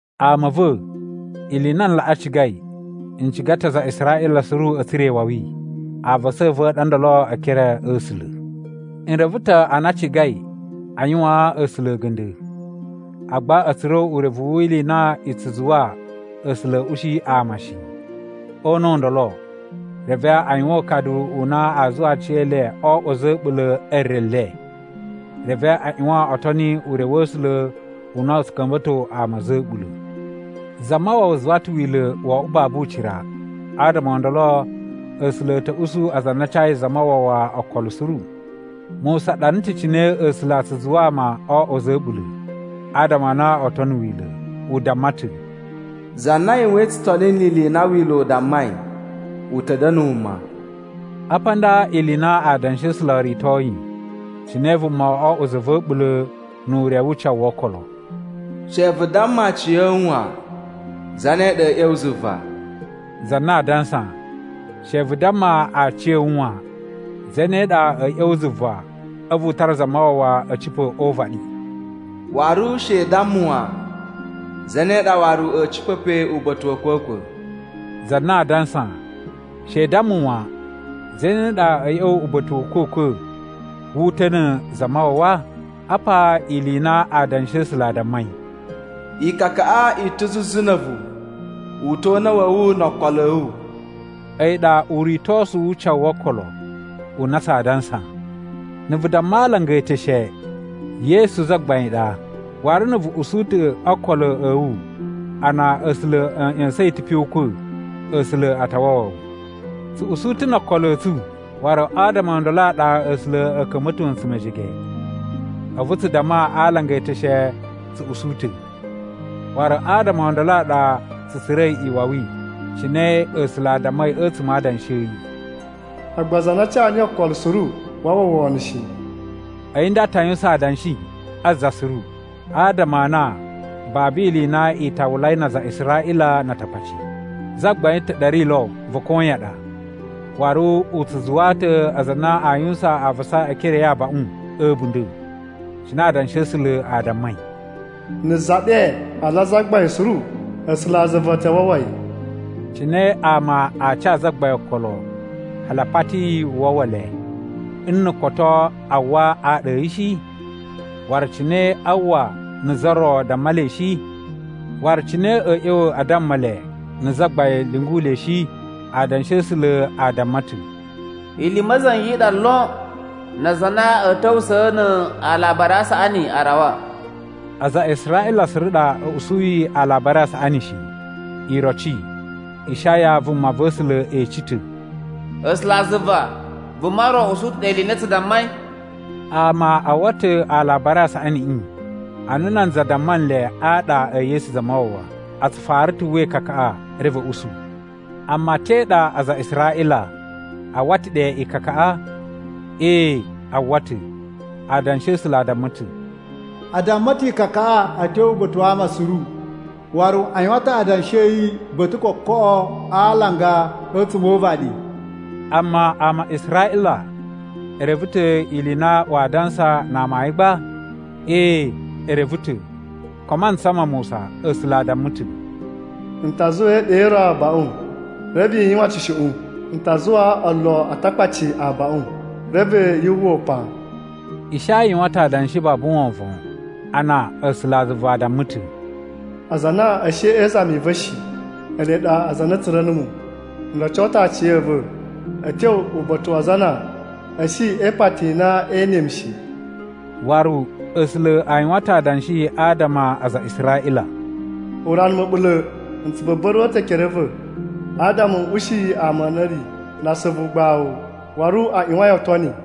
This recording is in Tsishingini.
Ama a̱ va̱, ili i na n laꞌa cigai, n ciga ta̱ aza a Israꞌila suru a̱ tsura̱ iwawi. Avasa a̱ va̱ a ɗa ndolo e ekere a̱ A̱sula̱. N reve ta̱ a na a cigai a yuwaan A̱sula̱ a̱ga̱nda̱, agba a̱ tsura̱ urevu wi ili i na i tsu zuwa A̱sula̱ a̱ ushi ama shi. O una̱ u ndolo, reve a yuwan ukadu u na a zuwa aciyele o oꞌwo a̱za̱ a̱ a̱ɓula̱ e re le. Reve a ꞌyuwan o toni ure wa̱ A̱sula̱ u na u tsu ka̱mba̱to ama a̱za̱ a̱ a̱ɓula̱. Zamawawa zuwa ta̱ Wila̱ wo oꞌwo babu ucira, adama o ndolo A̱sula̱ a̱ ta̱ usu aza a na a cayi Zamawawa okolo suru. Musa ɗana ta̱ cine A̱sula̱ a tsu zuwa ama o oꞌwo a̱za̱ a̱ a̱ɓula̱ adama a na oo tono Wila̱. U damma ta̱, “Za na yuwain tsutoni ni ili i na Wila̱ u dammai, u ta̱ da̱na̱ wuma.” Apa nda ili i na Adanshi a̱ A̱sula̱ o ritoyi cine vuma o oꞌwo za va̱ a̱ɓula̱ nu ure wu ucawu wo okolo: “She vu damma aciya̱wu wan, ‘Zane ɗa a̱a̱ ꞌya̱wa̱ zuva?’” (Za na a dansa, “She vu damma aciya̱wu wan, ‘Zane ɗa a̱a̱ ꞌya̱wa̱ zuva a̱vu u tara Zamawawa a̱ cipa̱ o uvaɗi?’”) “Waru she i damma wan, ‘Zane ɗa waru a̱a̱ cipa̱ pe uba̱ta̱ wa̱ a̱kwa̱kwa̱?’” (Za na a dansa, “She i damma wan, ‘Zane ɗa a̱a̱ ꞌya̱wa̱ uba̱ta̱ wa̱ a̱kwa̱kwa̱ wu uta̱ na̱ Zamawawa?’”) Apa ili i na Adanshi a̱ A̱sula̱ a dammai: “Ikakaꞌa i ta̱ zuzu na̱ a̱vu, u ta̱ o una̱ wa̱ wu no o okolo a̱ wu.” A̱yi ɗa uritosu wu ucawu wo okolo u na tsaa dansa. Na̱ vu damma a alanga e eteshe, “Yesu Zagbain ɗa,” waru na̱ vu usu ta̱ o okolo a̱ wu a na A̱sula̱ a̱ ꞌya̱sa̱n yi ta̱ pe o ukwa̱, A̱sula̱ a ta wawa wu. Tsu usu ta̱ no okolo a̱ tsu, waru adama o ndolo a ɗa A̱sula̱ a̱ ka̱mba̱to ntsu mejege. A̱vu tsu damma a alanga e eteshe tsu usu ta̱, waru adama o ndolo a ɗa tsu tsura̱i iwawi. Cine A̱sula̱ a dammai a̱tsuma̱ a Adanshi a̱ yi, “Agba za na ca niyi okolo suru waa uwwa wono shi.” A̱yi nda ta yuwusan adanshi a za suru, adama a na babu ili i na i tawulai na aza a Israꞌila na Atakpaci. Zagbain ta̱ ɗa ri lo va̱ koyan ɗa. Waru u tsu zuwaa ta̱ aza a na a yuwusan avasa e ekere a̱ yi abaꞌun a̱ a̱bunda̱. Cine Adanshi a̱ A̱sula̱ a dammai, “Na̱ za ɗe a ala a Zagbain suru, A̱sulazuva a ta wawa yi.” Cine ama aa ca Zagbain okolo hali a pati yi u wawa le, nna̱ koto a uwwa aɗa a̱ yi shi? Waru cine a uwwa, na̱ za ro damma le shi? Waru cine a̱a̱ ꞌya̱wa̱ a damma le, na̱ Zagbain lyungu le shi? Adanshi a̱ A̱sula̱ a damma ta̱, “Ili i ma̱za̱nga̱ i ɗa lon na aza a na a̱a̱ ta̱wusa̱ na a alabari a saꞌani a rawa.” Aza a Israꞌila suru ɗa a̱ usuyi Alabari a Saꞌaniꞌi shi. Iroci, Ishaya vumava̱sula̱ ece ta̱, “A̱sulazuva, vuma ro usu ta̱ ɗe ili i na tsu dammai?” Ama a uwwa ta̱ Alabari a Saꞌaniꞌi ana nanza damma nle aɗa e Yesu Zamawawa. A tsu fara ta̱ uwwa ikakaꞌa, reve a̱ usu. Amma te ɗa aza a Israꞌila? A uwwa ta̱ ɗe ikakaꞌa? Ee, a uwwa ta̱! Adanshi a̱ A̱sula̱ a damma ta̱: “A damma ta̱ ikakaꞌa a̱ tyo uba̱ta̱ wa ama suru. Waru a yuwan ta̱ adanshi a̱ yi ba̱ta̱ kokoꞌo a alanga a̱tsuma̱ o uvaɗi.” Amma ama a Israꞌila e reve ta̱ ili i na waa dansa na amayun gba? Ee, e reve ta̱, ko a mantsa ma Musa, A̱sula̱ a damma ta̱, “N ta zuwaa iɗa i ro abaꞌun, reve i yuwan tsushuꞌun N ta zuwaa olo Atakpaci abaꞌun, reve yu uwwa upan.” Ishaya yuwan ta̱ adanshi babu wovon a na A̱sulazuva a damma ta̱, “Aza a na a̱ shi e izami i va̱ shi, ele ɗa aza a na a̱ tsura̱ numu. N roco ta̱ aciya̱va̱ a̱ tyo uba̱ta̱ wa aza a na a̱ shi e ipati i na ee ene mu shi.” Waru A̱sula̱ a yuwan ta̱ adanshi adama a aza a Israꞌila, “Urana ma̱ɓula̱ n tsu buba̱ruwa̱ ta̱ ekere a̱ va̱ adama n ushi ama a na a̱ ri na asuvu ugbawu waru a ꞌyuwain o toni.”